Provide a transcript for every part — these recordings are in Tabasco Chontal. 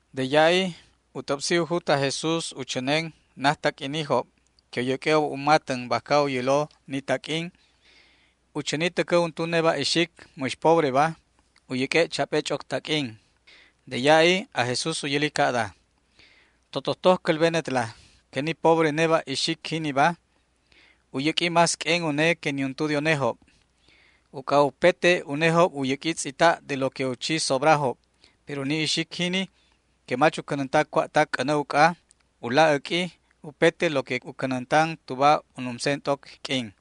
De ya'i u t'äbsi u jut aj Jesús u chänen najtaq'uinijob que u yäq'ue'ob u matän bajca u yälo ni taq'uin. U chäni täcä untu neba' ixic mäx pobreba u yäq'ue' chap'e ch'oc taq'uin. De ya'i aj Jesús u yäli ca'da: ―Totojtoj cälbenetla que ni pobre neba' ixic jiniba, ca' a wälä u yäq'ui más q'uen une que niuntu de unejob. Uc'a upete unejob u yäq'ui tz'ita' de lo que u chi sobrajob, pero ni ixic jini que mach u cänänta cua'tac c'änä uc'a, u laj äq'ui upete lo que u cänäntan tuba u numsen t'oc q'uin.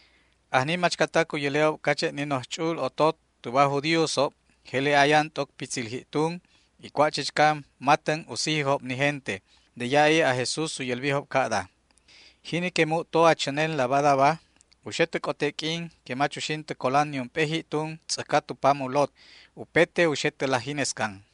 Ajni machcatac u yäle'ob cache' ni noj ch'u'ul otot tuba aj judíosob jele ayan t'oc pitzil ji'tun y cua' chichca matän u sijijob ni gente. De ya'i aj Jesús u yälbijob ca'da: ―Jini que mu'to a chänenla badaba u xe tä c'ote q'uin que mach uxin tä colan niump'e ji'tun tz'äjca tu pam u lot. Upete u xe tä laj jinescan.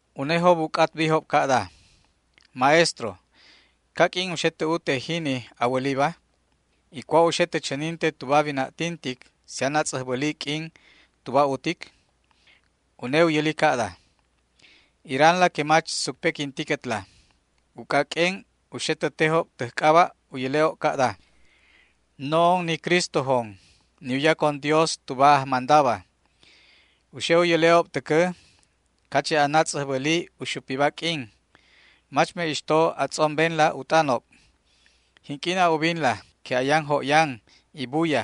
Unejob u c'atbijob ca'da: ―Maestro, ¿caq'uin u xe tä ajtä na wäliba? ¿Y cua' u xe tä chäninte tuba wina'tintic si anatz'äjbäli q'uin tuba utic? Une u yäli ca'da: ―Iranla que mach sucpequintiquetla, uc'a q'uen u xe tä tejob täj c'aba' u yäle' ca'da: “No'on ni Cristojon, ni u yacon Dios tuba ajmandaba”. U xe u yäle'ob täcä cache' anatz'äjbäli u xupiba q'uin. Mach me'ixto a tz'ombenla u t'anob. Jinq'uin a ubinla que ayan jo'yan y buya,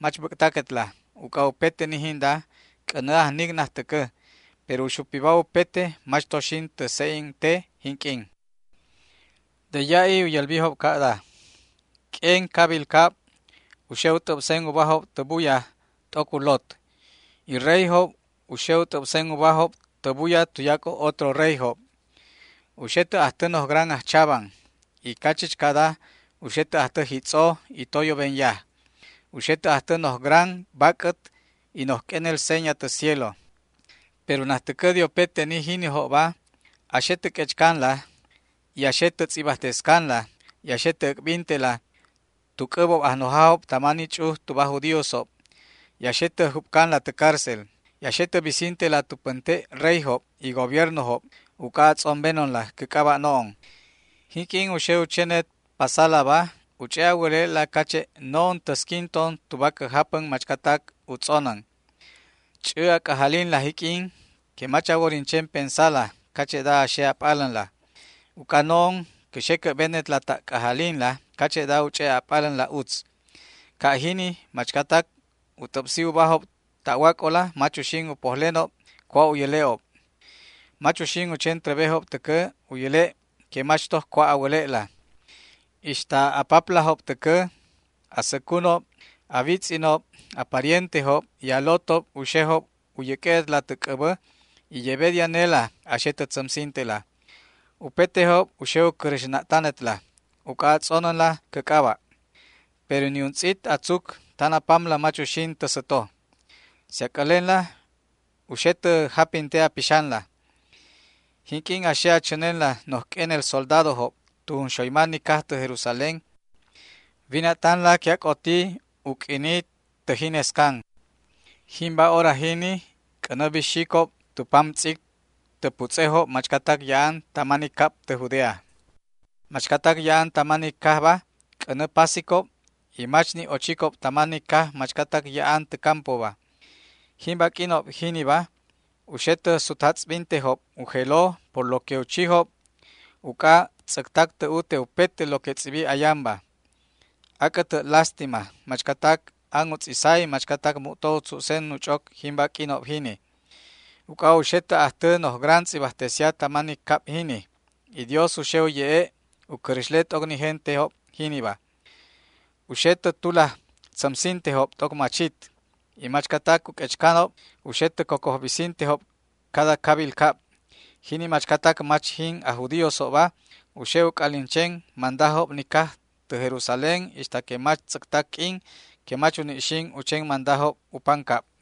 mach bäc'taquetla, uc'a upete ni jinda c'änä ajnic najtäcä, pero u xupiba upete mach to xin tä se'en te jinq'uin. De ya'i u yälbijob ca'da: ―Q'uen cabil cab u xe u t'äbsen ubajob tä buya t'oc u lot. Y reyjob u xe u t'äbsen ubajob tä buya tuyac'o otro reyjob. U xe tä ajtä noj gran ajchaban, y cachichcada u xe tä ajtä jitz'o y toyoben yaj. U xe tä ajtä noj gran bac'ät y noj q'uenel seña tä cielo. ’Pero najtäcä de upete ni jinijobba a xe tä q'uechcanla y a xe tä tz'ibajtescanla y a xe tä äc'bintela tu c'äbob ajnojajob tama ni ch'uj tuba aj judíosob y a xe tä jup'canla tä cárcel. A xe tä bisintela tu pänte' reyjob y gobiernojob uc'a a tz'ombenonla cä c'aba' no'on. Jinq'uin u xe u chenet pasalaba u ch'e' a wäle'la cache' no'on täsquinton tuba cä japän machcatac u tz'onän. Ch'ä a c'ajalinla jiq'uin que mach a worin chen pensala cache'da a xe a p'alänla. Uc'a no'on cä xe cä'benetla ta' c'ajalinla cache'da u ch'e' a p'alänla utz. Ca' jini machcatac u t'äbsi ubajob ta'wac'ola mach uxin u pojlenob cua' u yäle'ob. Mach uxin u chen trebejob täcä u yäle' que mach toj cua' a wäle'la. Ixta a paplajob täcä, a säcunob, a witz'inob, a parientejob y a lotob u xejob u yäq'ue'etla tä c'äbä, y yebe de anela a xe tä tzämsintela. Upetejob u xe u cräxna'tanetla uc'a a tz'onänla cä c'aba'. Pero niuntz'it a tzuc tan a pamla mach uxin tä säto. Si a c'älenla, u xe tä japinte a pixanla. ’Jinq'uin a xe a chänenla noj q'uenel soldadojob tu junxoyma ni caj tä Jerusalén, wina'tanla que ac'oti u q'uini tä jinescan. Jimba hora jini c'änä bixicob tu pam tz'ic tä putz'ejob machcatac ya'an tama ni cab tä Judea. Machcatac ya'an tama ni cajba c'änä pasicob, y mach ni' ochicob tama ni caj machcatac ya'an tä campoba. Jimba q'uinob jiniba u xe tä sutjatz'bintejob u jelo por lo que u chijobba uc'a tz'äctac tä ute upete lo que tz'ibi ayanba. ¡Ac'ä lástima machcatac an u tz'isa y machcatac mu'to u tzu'sen u ch'oc jimba q'uinob jini! Uc'a u xe tä ajtä noj gran tz'ibajtesia tama ni cab jini, y Dios u xe u ye'e' u cräxle t'oc ni gentejob jiniba. U xe tä tulaj tzämsintejob t'oc machit, y machcatac u q'uechcanob u xe tä cocoj bisintejob cada cabil cab. Jini machcatac mach jin aj judíosob u xe u c'alin chen mandajob ni caj tä Jerusalén ixta que mach tz'äctac q'uin que mach uni' xin u chen mandajob u pancab.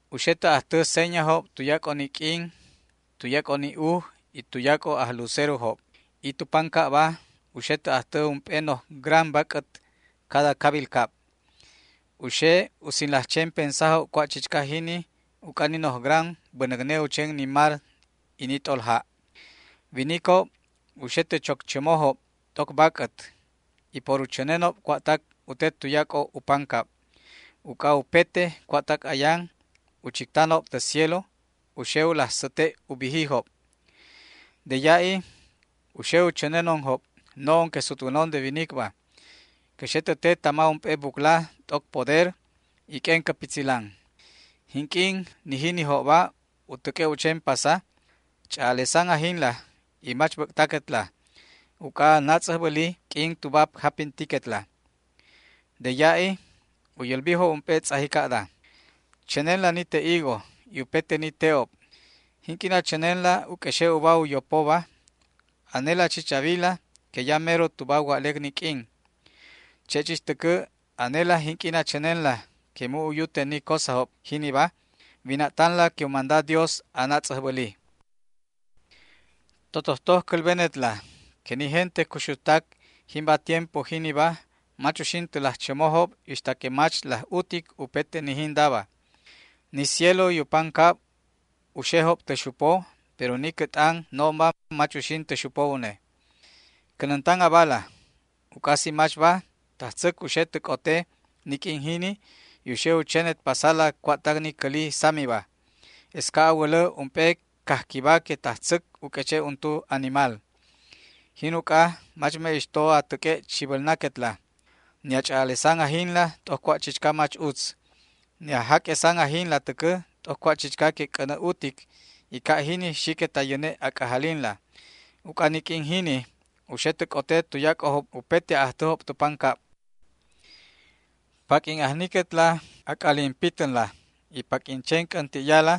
’U xe tä ajtä señajob tuyac'o ni q'uin, tuyac'o ni uj y tuyac'o ajlucerojob, y tu pancabba u xe tä ajtä ump'e noj gran bac'ät cada cabil cab. U xe u sinlaj chen pensajob cua' chichca jini uc'a ni noj gran bänäcne u chen ni mar y ni t'olja'. Winicob u xe tä choc chämojob t'oc bac'ät y por u chänenob cua'tac u te tuyac'o u pancab, uc'a upete cua'tac ayan u chictanob tä cielo u xe u laj säte' u bijijob. De ya'i u xe u chänenonjob, no'on que sutwänon de winicba. Cä xe tä te tama ump'e bucla t'oc poder y q'uen cä pitzilan. Jinq'uin ni jinijobba u täq'ue' u chen pasa, ch'a'alesan ajinla y mach bäc'taquetla, uc'a anatz'äjbäli q'uin tuba japintiquetla. De ya'i u yälbijob ump'e tz'aji ca'da: ―Chänenla ni te' higo y upete ni te'ob. Jinq'uin a chänenla u q'uexe' uba u yopoba, anela chich a wila que ya mero tuba wa'lec ni q'uin. Che' chich täcä anela, jinq'uin a chänenla que mu' u yute ni cosajob jiniba, wina'tanla que u manda Dios anatz'äjbäli. ’Totojtoj cälbenetla que ni gente cuxujtac jimba tiempo jiniba mach uxin tä laj chämojob ixta que mach laj utic upete ni jindaba. Ni cielo y u pancabba u xejob tä xupo, pero ni cä t'an no'onba mach uxin tä xupo une. ’Cänäntan abala, uc'a si machba, tajtzäc u xe tä c'ote ni q'uin jini y u xe u chenet pasala cua'tac ni cäli samiba. Es ca' a wälä ump'e cajquiba que tajtzäc u q'ueche' untu animal. Jin uc'a mach me'ixto a täq'ue' chibälnaquetla, ni a ch'a'alesan ajinla t'oc cua' chichca mach utz, ni a jaq'uesan ajinla täcä t'oc cua' chichca que c'änä utic, y ca' jini xiquet a yäne' a c'ajalinla. Uc'a ni q'uin jini u xe tä c'ote tuyac'ojob upete a'ajtäjob tu pancab. Paq'uin ajniquet a c'alin pitänla y paq'uin chen c'änti'yala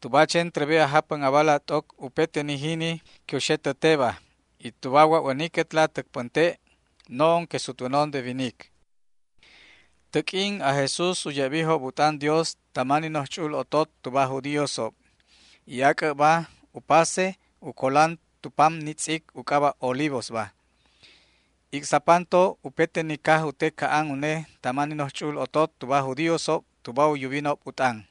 tuba a chen trebe a japän abala t'oc upete ni jini que u xe tä teba, y tuba wa'wäniquetla täc pänte' no'on que sutwänon de winic. Tä q'uin aj Jesús u ye'bijob u t'an Dios tama ni noj ch'u'ul otot tuba aj judíosob, y ac'äbba u pase u colan tu pam ni tz'ic u c'aba' Olivosba. Ic'sapanto upete ni caj u te ca'an une tama ni noj ch'u'ul otot tuba aj judíosob tuba u yubinob u t'an.